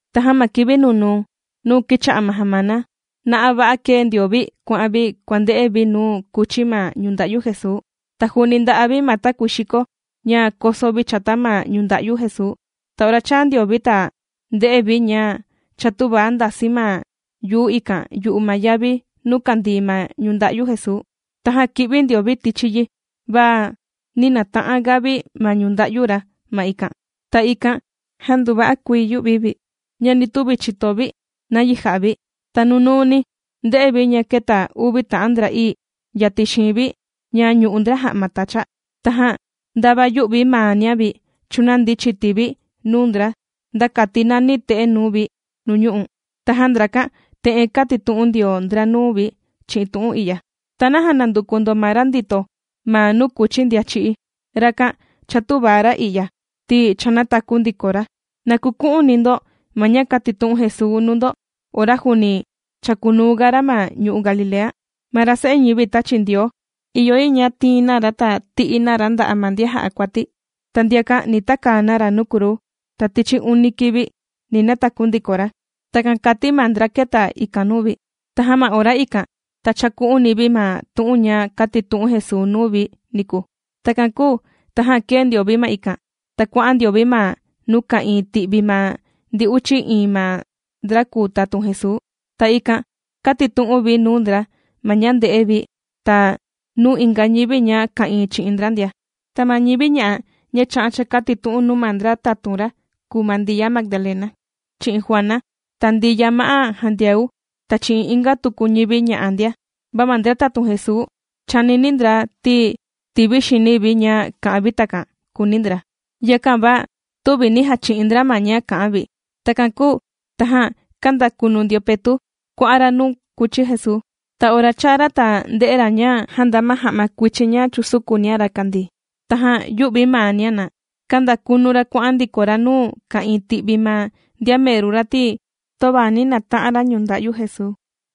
Tajan ma kivi nunuu nuu kìcha'a ma jamana, na'a va'a kēe ndio vi kuà'an vi kuànde'e vi nuu kūchi ma ñunda'yu Jesuu. Ta juuni ndà'a vi ma takuii xiko ña koso vi chata ma ñunda'yu Jesuu. Ta ora chāa ndio vi ta ndē'e vi ña cha tüva ndàsi ma yuu ikan yu'u ma yavi nuu kàndii ma ñunda'yu Jesuu. Tajan kī'vi ndio vi tichi yi va nī nata'an ga vi ma ñunda'yu ra ma ikan. Ta ikan jan nduva'a kuii yū'vi vi ña nī tuvi chìto vi nayi jà'a vi. Ta nunuuni ndē'e vi ña kēta uvi ta'an ndra'ii yatin xiin vi ña ñù'u ndra ja'ma tacha. Tajan ndava yū'vi maania vi chūnandi chiti vi nuu ndra nda kati nani te'e nuu vi nuu ñu'u'. Tajan ndrakan te'en kātitu'un ndio ndra nuu vi chi'in tu'un i'ya: ―¿Ta naja nànduku ndo ma ra ndito ma nuu kùchi ndian chì'í? Rakan cha tüva ra i'ya, ti cha nātaku ndiko ra. Na kuku'uni ndo ma ña kātitu'un Jesuu nuu ndo ora juuni chākunuu ga ra ma ñu'u' Galilea: “Ma ra Se'e ñivi tāchi Ndioo, ìyo yi ña tiin na ra ta ti'i na ra nda'a' ma ndian jà'a kuati. Ta ndiakan ni takaa na ra nuu kruu, ta tichi uni kivi ni nataku ndiko ra.” Takan kàti ma ndra kēta ikan nuu vi. Tajan ma ora ikan ta chāku'uni vi ma tu'un ña kātitu'un Jesuu nuu vi niku. Takan kūu tajan kēe ndio vi ma ikan, ta kuà'an ndio vi ma nuu ka'ìin ti'vi ma ndi uchi iin ma ndra kùu tatun Jesuu, ta ikan kātitu'un vi nuu ndra ma ña ndē'e vi ta nuu inga ñivi ña ka'ìin chi'in ndra ndia. Ta ma ñivi ña'a ña chā'an chākatitu'un nuu ma ndra tatun ra kùu ma Ndiya Magdalena chi'in Juana, ta Ndiya ma'á Jandiau, ta chi'in inga tuku ñivi ña'a ndia. Va ma ndra tatun Jesuu chànini ndra ti tìvi xini vi ña kā'an vi takan, kùuni ndra. Yakan va tüvi nī jachi'in ndra ma ña kà'an vi. Takan kūu tajan kāndakunu ndio Petu' kuà'an ra nuu kūchi Jesuu. Ta ora chāa ra ta ndē'e ra ña jāndaa ma ja'ma kuichin ña chūsukunia ra kàndii, tajan yū'vi maania ra kāndakunu ra kuà'an ndiko ra nuu ka'ìin ti'vi ma ndian meru ra, ti töva nī nata'an ra ñunda'yu Jesuu.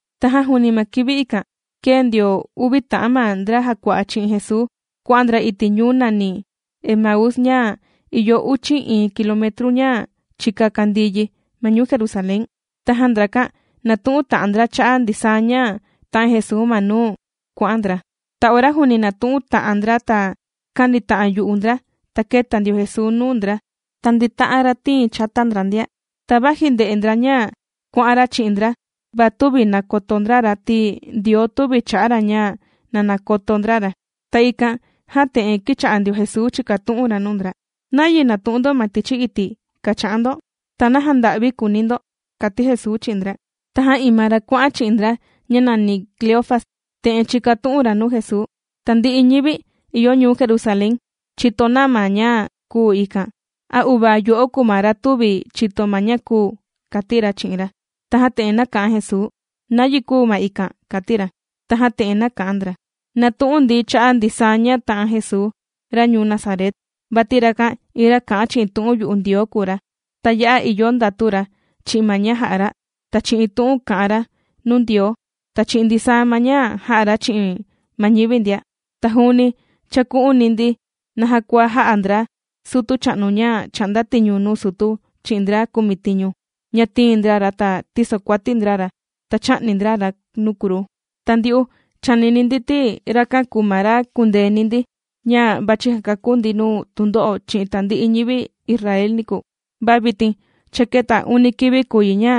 Tajan juuni ma kivi ikan, kēe ndio uvi ta'an ma ndra jàkua'a chi'in Jesuu kuà'an ndra iti' ñuu nàni Emaús ña ìyo uchi iin kilometru ña chika kàndii yi ma ñuu Jerusalén. Tajan ndrakan, nàtu'un ta'an ndra cha'a' ndisaa ña tā'an Jesuu ma nuu kuà'an ndra. Ta ora juuni nàtu'un ta'an ndra ta kànita'an yu'u ndra, ta kēta ndio Jesuu nuu ndra ta ndīta'an ra tiin chata ndra ndia. Ta vaji ndè'e ndra ña kuà'an ra chi'in ndra, va tüvi nàkoto ndra ra, ti Ndioo tüvi chà'a ra ña na nakoto ndra ra. Ta ikan jan te'en kīcha'a ndio Jesuu chìkatu'un ra nuu ndra: ―¿Nayi nàtu'un ndo ma tichi iti' kàcha'an ndo? ¿Ta naja nda'vi kùuni ndo? ―kàti Jesuu chi'in ndra. Tajan iin ma ra kuà'an chi'in ndra ña nàni Cleofas, te'en chīkatu'un ra nuu Jesuu: ―Tandi'i ñivi ìyo ñuu Jerusalén chìto na ma ña kūu ikan. ¿A uvaa yo'o kùu ma ra tüvi chìto ma ña kūu? ―kàti ra chi'in ra. Tajan te'en nāka'an Jesuu: ―¿Nayi kūu ma ikan? ―kàti ra. Tajan te'en nāka'an ndra: ―Nàtu'un ndi cha'a' ndisaa ña tā'an Jesuu ra ñuu Nazaret, vati rakan iin ra kà'an chi'in tu'un yu'u Ndioo kùu ra. Ta ya'a ìyo ndatu ra chi'in ma ña jà'a ra, ta chi'in tu'un kà'an ra nuu Ndioo, ta chi'in ndisaa ma ña jà'a ra chi'in ma ñivi ndia. Ta juuni chāku'uni ndi naja kua jā'a ndra sutu chà'nu ña chà'nda tiñu nuu sutu chi'in ndra kumitiñu ña tīin ndra ra ta tīsokuati ndra ra ta chā'ni ndra ra nuu kruu. Ta ndyu'u chànini ndi ti rakan kūu ma ra kùndeeni ndi ña vàchi jakakú ndi nuu tundo'o chi'in tandi'i ñivi Israel niku, va vitin cha kēta uni kivi kùu yi ña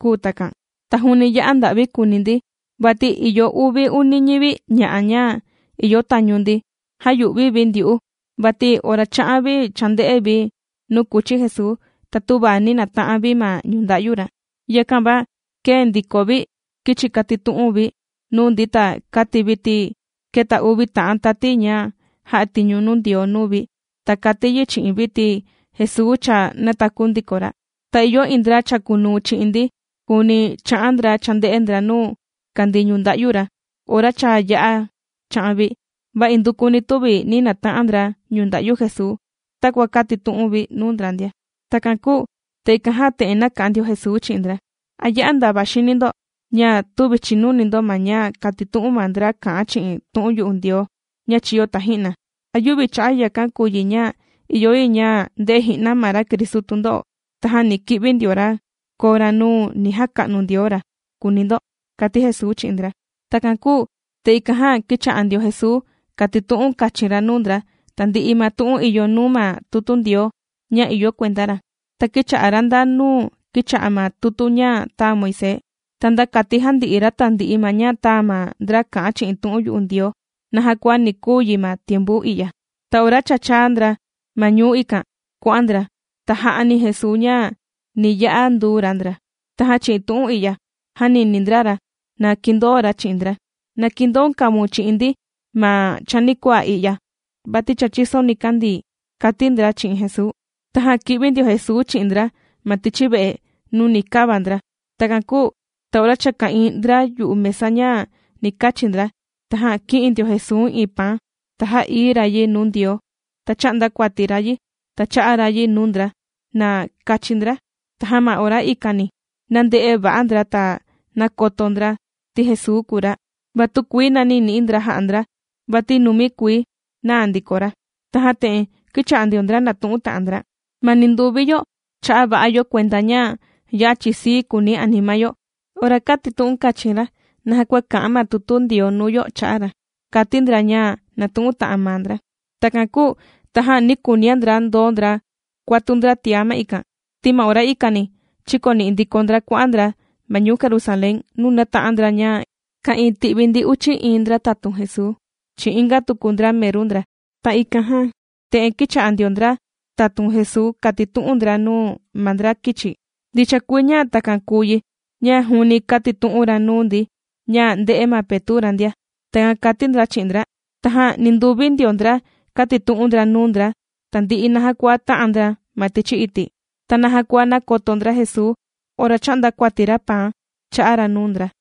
kūu takan. Ta juuni ya'a nda'vi kùuni ndi, vati ìyo uvi uni ñivi ña'a ña ìyo tañu ndi jāyu'vi vi ndyu'u vati ora chā'an vi chānde'e vi nuu kūchi Jesuu, ta töva ni nāta'an vi ma ñunda'yu ra. Yakan va kēe ndiko vi kīchi katitu'un vi nuu ndi ta kàti vi ti kēta uvi ta'an tati ña jà'a tiñu nuu Ndioo nuu vi, ta kāti yi chi'in vi ti Jesuu cha nātaku ndiko ra. Ta ìyo iin ndra chàkunuu chi'in ndi, juuni chā'a ndra chānde'e ndra nuu kàndii ñunda'yu ra ora cha yā'a cha'an vi. Va indukuni tüvi nī nata'an ndra ñunda'yu Jesuu, takua kātitu'un vi nuu ndra ndia. Takan kūu ta ikan jan te'en nāka'an ndio Jesuu chi'in ndra: ―¿A ya'a ndava xini ndo ña tüvi chìnuni ndo ma ña kātitu'un ma ndra kà'an chi'in tu'un yu'u Ndioo ña chīyo taji'na? ¿A yüvi cha'a' yakan kùu yi ña ìyo yi ña ndè'e ji'na ma ra Cristu tundo'o, tajan ni ki'vi ndio ra koo ra nuu ni jaka'nu Ndioo ra?, kùuni ndo ―kàti Jesuu chi'in ndra. Takan kūu ta ikan jan kīcha'a ndio Jesuu kàtitu'un kachin ra nuu ndra tandi'i ma tu'un ìyo nuu ma tutu Ndioo ña ìyo kuenda ra, ta kīcha'a ra nda nuu kìcha'a ma tutu ña tāa Moisés, ta nda kati jandi'i ra tandi'i ma ña tāa ma ndra kà'an chi'in tu'un yu'u Ndioo naja kua ni kuu yi ma tiempu i'ya. Ta ora cha chāa ndra ma ñuu ikan kuà'an ndra, tajan jā'ani Jesuu ña ni yā'a nduu ra ndra. Tajan chi'in tu'un i'ya jānini ndra ra na kindoo ra chi'in ndra: ―¡Na kindoun kavaun chi'in ndi ma chanikuaa i'ya, vati cha chìso nikandii! ―kàti ndra chi'in Jesuu. Tajan kī'vi ndio Jesuu chi'in ndra ma tichi ve'e nuu ni kava ndra. Takan kūu ta ora cha ka'ìin ndra yu'u mesa ña ni kachi ndra, tajan kī'in ndio Jesuu iin paan ta jā'ií ra yi nuu Ndioo, ta chā'nda kuati ra yi ta chā'a ra yi nuu ndra na kachi ndra. Tajan ma ora ikani nānde'e va'a ndra ta nākoto ndra ti Jesuu kùu ra, va tükuii nàni ni'i ndra ja'a ndra vati numi kuii naa ndiko ra. Tajan te'en kīcha'a ndio ndra nàtu'un ta'an ndra: ―Ma ninduvi yo chā'a va'a yo kuenda ña ya'a chìsii kuuni anima yo ora kātitu'un kachin ra naja kua kà'an ma tutu Ndioo nuu yo cha'a' ra ―kàti ndra ña nātu'un ta'an maa ndra. Takan kūu tajan nī kuunia ndra ndoo ndra kuatu ndra tiá ma ikan, ti ma ora ikani chīkoni'i ndiko ndra kuà'an ndra ma ñuu Jerusalén nuu nāta'an ndra ña ka'ìin ti'vi ndi uchi iin ndra tatun Jesuu chi'in inga tuku ndra meru ndra. Ta ikan jan te'en kīcha'a ndio ndra tatun Jesuu kàtitu'un ndra nuu ma ndra kīchi: ―Ndicha kuii ña takan kùu yi ña juuni kātitu'un ra nuu ndi ña ndē'e ma Petu' ra ndia. ―Takan kàti ndra chi'in ndra. Tajan ninduvi ndio ndra kātitu'un ndra nuu ndra tandi'i naja kua tā'an ndra ma tichi iti', ta naja kua nākoto ndra Jesuu ora chā'nda kuati ra paan chā'a ra nuu ndra.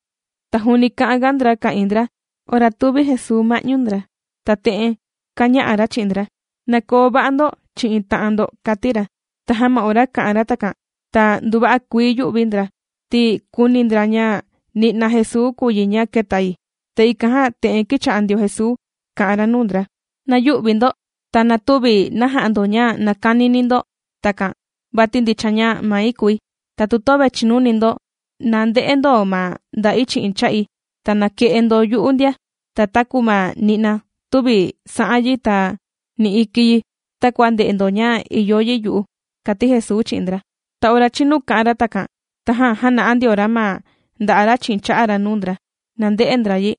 Ta juuni kà'an ga ndra ka'ìin ndra ora tūvi Jesuu ma'ñu ndra, ta te'en kāña'a ra chi'in ndra: ―Na koo va'a ndo chi'in ta'an ndo ―kàti ra. Tajan ma ora kā'an ra takan ta nduva'a kuii yū'vi ndra, ti kūuni ndra ña ni'na Jesuu kùu yi ña kēta yi. Ta ikan jan te'en kīcha'a ndio Jesuu kà'an ra nuu ndra: ―¡Na yü'vi ndo! Ta na tüvi na ja'a ndo ña nàkanini ndo takan, vati ndicha ña mai kùi. Ta tu töve chìnuni ndo, na nde'e ndo ma nda'i chi'in cha'i. Ta na ke'e ndo yu'u ndia, ta taku ma ni'na tüvi sa'an yi ta ni iki yi, takua ndè'e ndo ña ìyo yi yu'u ―kàti Jesuu chi'in ndra. Ta ora chīnu kā'an ra takan tajan jāna'a ndio ra ma nda'a' ra chi'in cha'a ra nuu ndra, na nde'e ndra yi.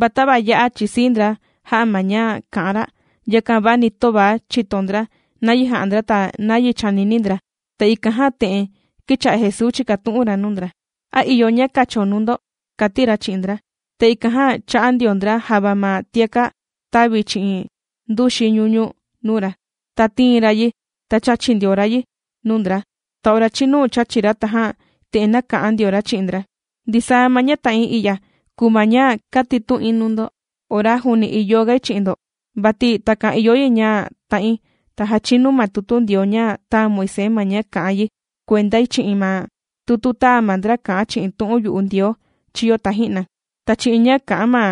Va tava ya'a chìsii ndra jà'a ma ña kà'an ra, yakan va ni töva chìto ndra nayi jà'a ndra ta nayi chànini ndra. Ta ikan jan te'en kīcha'a Jesuu chìkatu'un ra nuu ndra: ―¿A ìyo ña kacho nuu ndo? ―kàti ra chi'in ndra. Ta ikan jan chā'a ndio ndra java ma tiaka' tàvi chi'in nduxi ñuñu nuu ra. Ta tīin ra yi ta chāchi ndio ra yi nuu ndra. Ta ora chīnu chāchi ra tajan te'en nāka'an ndio ra chi'in ndra: ―Ndisaa ma ña tā'in i'ya kùu ma ña kātitu'in nuu ndo ora juuni ìyo gai chi'in ndo. Vati takan ìyo yi ña ta'in ta jachinu ma tutu Ndioo ña tāa Moisés ma ña kà'an yi kuendai chi'in ma tutu tāa ma ndra kà'an chi'in tu'un yu'u Ndioo chīyo taji'na, ta chi'in ña kà'an ma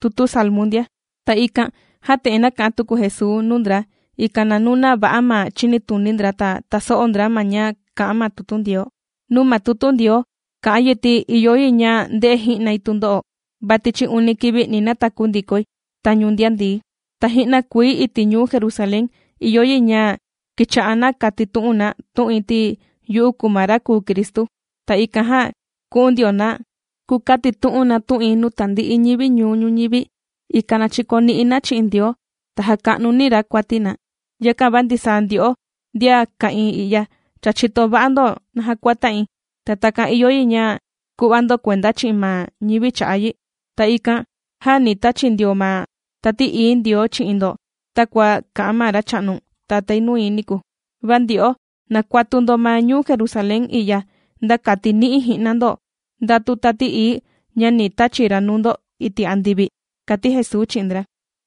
tutu Salmu ndia. Ta ikan jan te'en nāka'an tuku Jesuu nuu ndra, ikan na nuna va'a ma chìnituni ndra ta taso'o ndra ma ña kà'an ma tutu Ndioo: ―Nuu ma tutu Ndioo kà'an yi ti ìyo yi ña nde'e ji'nai tundo'o, va tichi uni kivi ni nataku ndikoi tañu ndian ndií. Ta ji'na kuii iti' ñuu Jerusalén ìyo yi ña kicha'a na katitu'un na tu'in, ti yu'u kùu ma ra kùu Cristu. Ta ikan jan ku'un ndio na kukatitu'un na tu'in nuu tandi'i ñivi ñuu ñuñivi, ikan na chikoni'i na chi'in Ndioo ta jaka'nuni ra kuati na. Yakan va ndisaa ndyo'o ndian ka'ìin i'ya cha chìto va'a ndo naja kua tā'in. Ta takan ìyo yi ña ku'va ndo kuenda chi'in ma ñivi cha'a' yi. Ta ikan jan ni tachi ndioi ma Tati Ií Ndioo chi'in ndo takua kā'an ma Racha'nu Tatái nui niku. Va ndyo'o na kuatu ndo ma ñuu Jerusalén i'ya, nda kati ni'i ji'na ndo ndatu Tati Ií ña ni tachi ra nuu ndo iti' andivi ―kàti Jesuu chi'in ndra.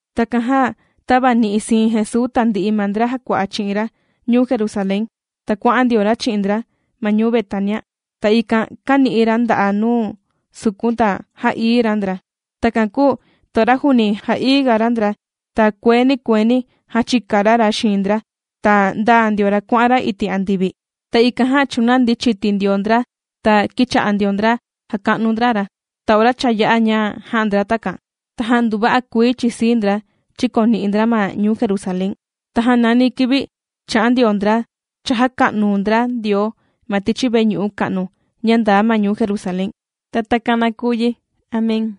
Takan jan tāvani'i siin Jesuu tandi'i ma ndra jàkua'a chi'in ra ñuu Jerusalén, ta kuà'an ndio ra chi'in ndra ma ñuu Betania. Ta ikan kāni'i ra nda'a' ra nuu sukun ta jā'ií ra ndra. Takan kūu ta ora juuni jà'ií ga ra ndra, ta kueeni kueeni jāchika ra ra xiin ndra, ta ndāa ndio ra kuà'an ra iti' andivi. Ta ikan jan chūnandi chiti ndio ndra ta kīcha'a ndio ndra jàka'nu ndra ra. Ta ora cha yā'a ña jā'a ndra takan, tajan nduva'a kuii chìsii ndra chìkoni'i ndra ma ñuu Jerusalén. Tajan nani kivi chà'an ndio ndra chàjaka'nu ndra Ndioo ma tichi veñu'u ka'nu ña ndaa ma ñuu Jerusalén. Ta takan na kuu yi. Amén.